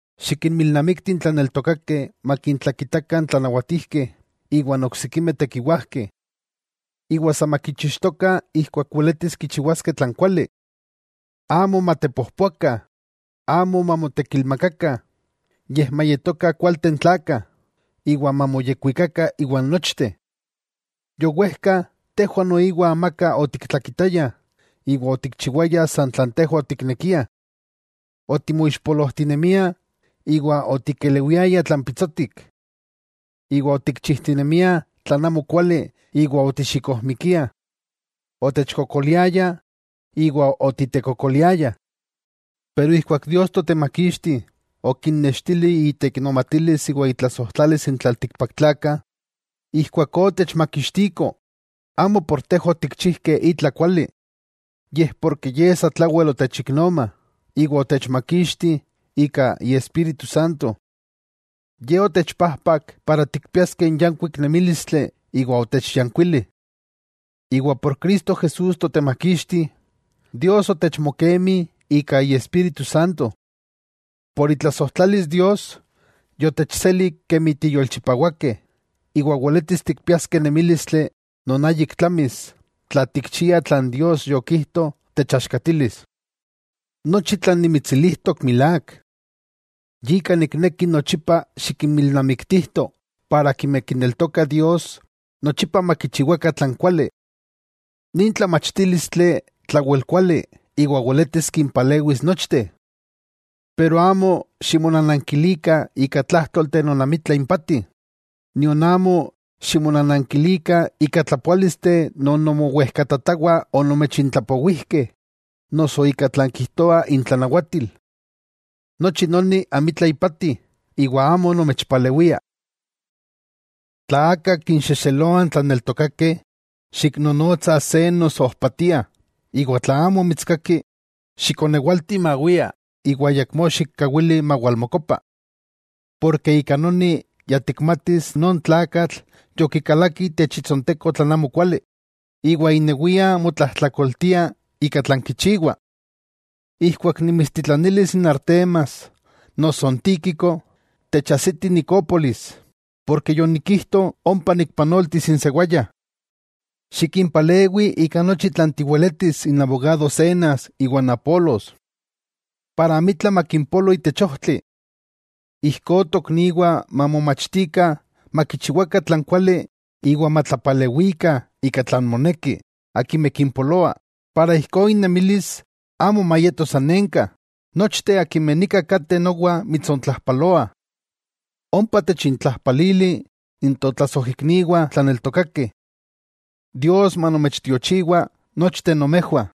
Xikinmilnamikti n tlaneltokakeh makintlakitakah n tlanawatijkeh iwa n oksikimeh tekiwajkeh. Iwa sa makichixtokah ijkuak weletis kichiwaskeh tlan kuali. Amo matepojpoakah, amo mamotekilmakakah, yej mayetokah kualteh n tlakah, iwa mamoyekwikakah iwan nochteh. Yowejka, tejwah noiwa amaka otiktlakitaya iwa otikchiwaya san tlan tejwah otiknekiah. Otimoixpolojtinemiah iwa otikelewiayah tlan pitsotik. Iwa otikchijtinemiah tlan amokuali iwa otixikojmikiah, otechkokoliayah iwa otitekokoliayah. Pero ijkuak Dios Totemakixti okinnextili iteiknomatilis iwa itlasojtlalis n tlaltikpaktlakah, ijkuakó otechmakixtiko, amo por tejwah otikchijkeh itla kuali, yej porke Ye satlawel otechiknoma, iwa otechmakixti ika Iespíritu Santo. Ye otechpajpak para tikpiaskeh n yankuik nemílistli iwa otechyánkuili. Iwa por Cristo Jesús Totemakixti, Dios otechmokemi ika Iespíritu Santo. Ika itlasojtlalis Dios yotechseli kemi tiyolchipawakeh, iwa weletis tikpiaskeh nemílistli non áyik tlamis tla tikchiah tlan Dios yokijto techaxkatilis. Nochi tlan nimitsilijtok milák. Yika nikneki nochipa xikinmilnamiktijto, ijkó akimeh kineltokah Dios nochipa makichiwakah tlan kuali. Nin tlamachtílistli tlawel kuali iwa weletis kimpalewis nochteh. Amo ximonanankilikah ika tlájtolteh non amitla impati, nion amo ximonanankilikah ika tlapoálisteh non nomowejkatatawah onomechintlapowijkeh noso ika tlan kijtoa intlanawatil. Nochi noni amitla ipati iwa amo nomechpalewia. Tla aka kinxexeloa n tlaneltokakeh, xiknonotsa se noso ojpatia, iwa tla amo mitskaki, xikonewalti mawia iwa ayakmó xikkawili mawalmokopa. Ika noni ya tikmatis non tlakatl yokikalaki itech itsonteko tlan amokuali, iwa inewia motlajtlakoltia ika tlan kichiwa. Ijkuak nimitstitlanilis n Artemas noso n Tíquico, techajsiti Nicópolis, porke yonikijto ompa nikpanoltis n sewaya. Xikinpalewi ika nochi tlan tiweletis n abogado Zenas, iwa n Apolos, amitla makimpolo itech ojtli. Ijkó tokniwah mamomachtikah makichiwakah tlan kuali iwa matlapalewikah ika tlan moneki akimeh kimpoloa, ijkó innemilis amo mayeto sanenka. Nochteh akimeh nika kateh nowa mitsontlajpaloah. Ompa techintlajpalili n totlasojikniwah tlaneltokakeh. Dios manomechtiochiwa nochteh nomejwah.